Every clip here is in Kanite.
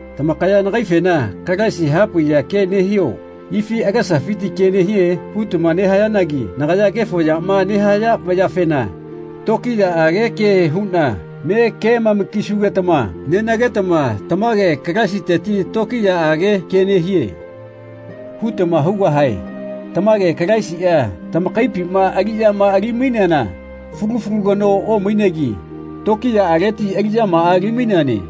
Tamakaya nagaifena “Kalaisi hapaiya ke nehio ifi agesafiti ke nehie?” hutama nehayanagi nagaya kefo yama nehaya vayafena tokiyaꞌage ke huꞌna me kemama-kisugetama nenagetama “Tamage Kalaisiteti tokiyaꞌage kea nehie.” hutama hugahae. Tamage Kalaisiꞌa tamakaipima aliꞌyama ali-maineana fulu fulu kanoa omainegi tokiyaꞌaleti aliꞌyamaꞌa ali-maineane.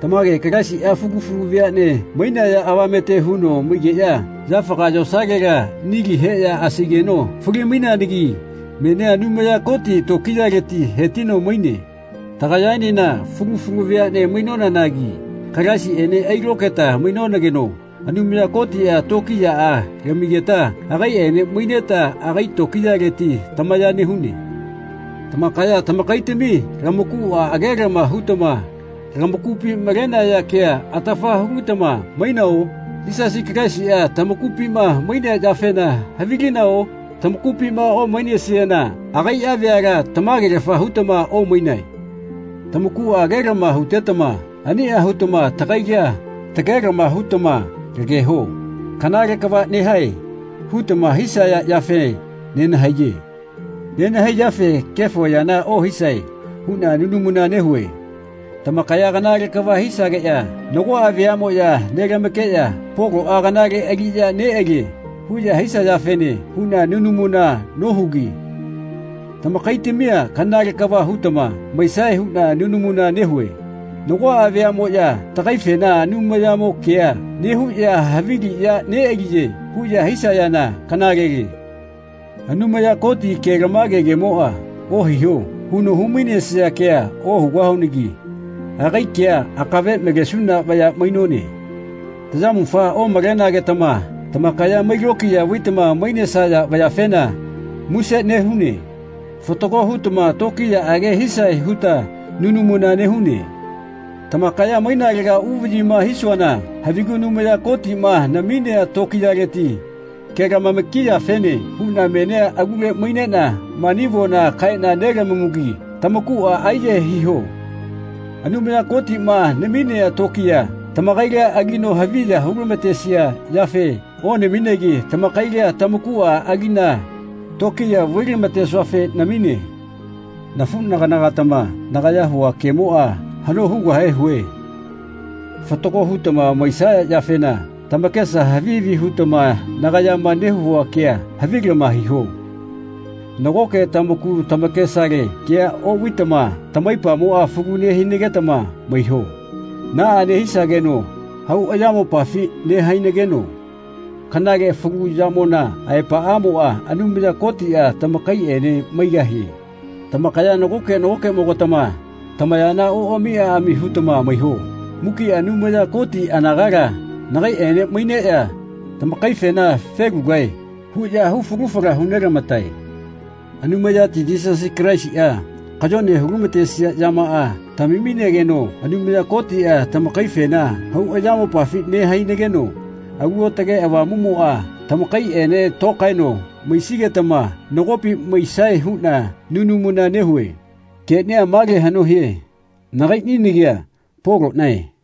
Tamage Kalaisiꞌa fulu fulu veaꞌne mainaya avamete huno maigeꞌya yafaga yosalela nili heꞌya asaigeno fali-maineanagi menia Anumaya Koti tokiyaleti hetino maine. Tagayaenena fulu fulu veaꞌne mainonanagi Kalaisiꞌene ailokaeta mainonageno Anumaya Kotiꞌa tokiyaꞌa lamigeta agaiꞌene maineta agai tokiyaleti tamaya nehune. Tamakaya tamakaitami lamakuꞌa agelama hutama lamakupi malenaya kea atafa hulitama mainao? Yisasi Kalaisiꞌa tamakupima mainea yafena havilinao? Tamakupima omainesiana agaiꞌa veala tamagelafa hutama omainae. Tamakuꞌa agelama hutetama aniꞌa hutama tagaila tagelama hutama lageho “Kanale kava nehae.” hutama hisaya yafe nenahaiye. Nenahaiyafe “Kefo yana ohisae.” huꞌna nunamuna nehue. Tamakaya kanale kava hisageꞌya nagoꞌa veaꞌmoꞌya nelamakeꞌya “Poloꞌa kanale aliꞌya neꞌalie.” huꞌya hisayafene huꞌna nunamuna nohugi tamakaitamia kanale kava hutama maisae huꞌna nunamuna nehue. Nagoꞌa vayaꞌmoꞌya tagaifena “Anumayamo kea nehuꞌya havi aliꞌya neꞌaliye.” huꞌya hisayana kanalele. Anumaya Koti kelamage kemoꞌa “Ohiho.” huno humainesia kea ohugahunagi agai kea akave malesuna vaya mainone. Tayamufa omalenagetama tamakaya mai lokiya vaitama mainesaya yafena muse nehune. Fatago hutama tokiyaꞌage hisae huta nunamuna nehune. Tamakaya mainalega uvaꞌyima hisuana havigu Anumaya Kotiꞌma naminea tokiyaleti kelamama-kiyafene huꞌna menia alule maineꞌna mani avona kaeꞌna nelamamugi tamakuꞌa aiyahae hiho. Anumaya Kotiꞌma naminea tokiya tamakaila alino haviya hulamatesia yafe onaminegi tamakaila tamakuꞌa aliꞌna tokiya vailamatesuafe namine. Nafuꞌnagana-gatama nagaya hua kemoꞌa haꞌno hugahe hue. Fatago hutama maisaya yafena tamakesa havi havi hutama nagayama nehua kea havilama hiho. Nagoke tamaku tamakesale kea oꞌvaitama tamaipamo falu nehinagetama maiho. Naꞌa nehisageno hau ayamopafi nehainageno kanale falu yamona aepaꞌamoꞌa Anumaya Kotiꞌa tamakaiꞌene maigahie. Tamakaya nagoke nagokeꞌmo-gatama tamayana oꞌami aꞌami hutama maiho. Mukiꞌa Anumaya Koti anagala nagaiꞌene maineꞌya tamakaifena “Felugae.” huꞌya hu falu fala hunelamatae. Anumayati Yisasi Kalaisiꞌa kayone hulamatesia yamaꞌa tamaminageno Anumaya Kotiꞌa tamakaifena hau ayamopafi nehainageno Alu Aotage Avamuꞌmoꞌa tamakaiꞌene tokaeno maisigetama nagopi maisae huꞌna nunamuna nehue. Keꞌnia male haꞌno hie. Nagaiꞌni nagia Poloꞌnae.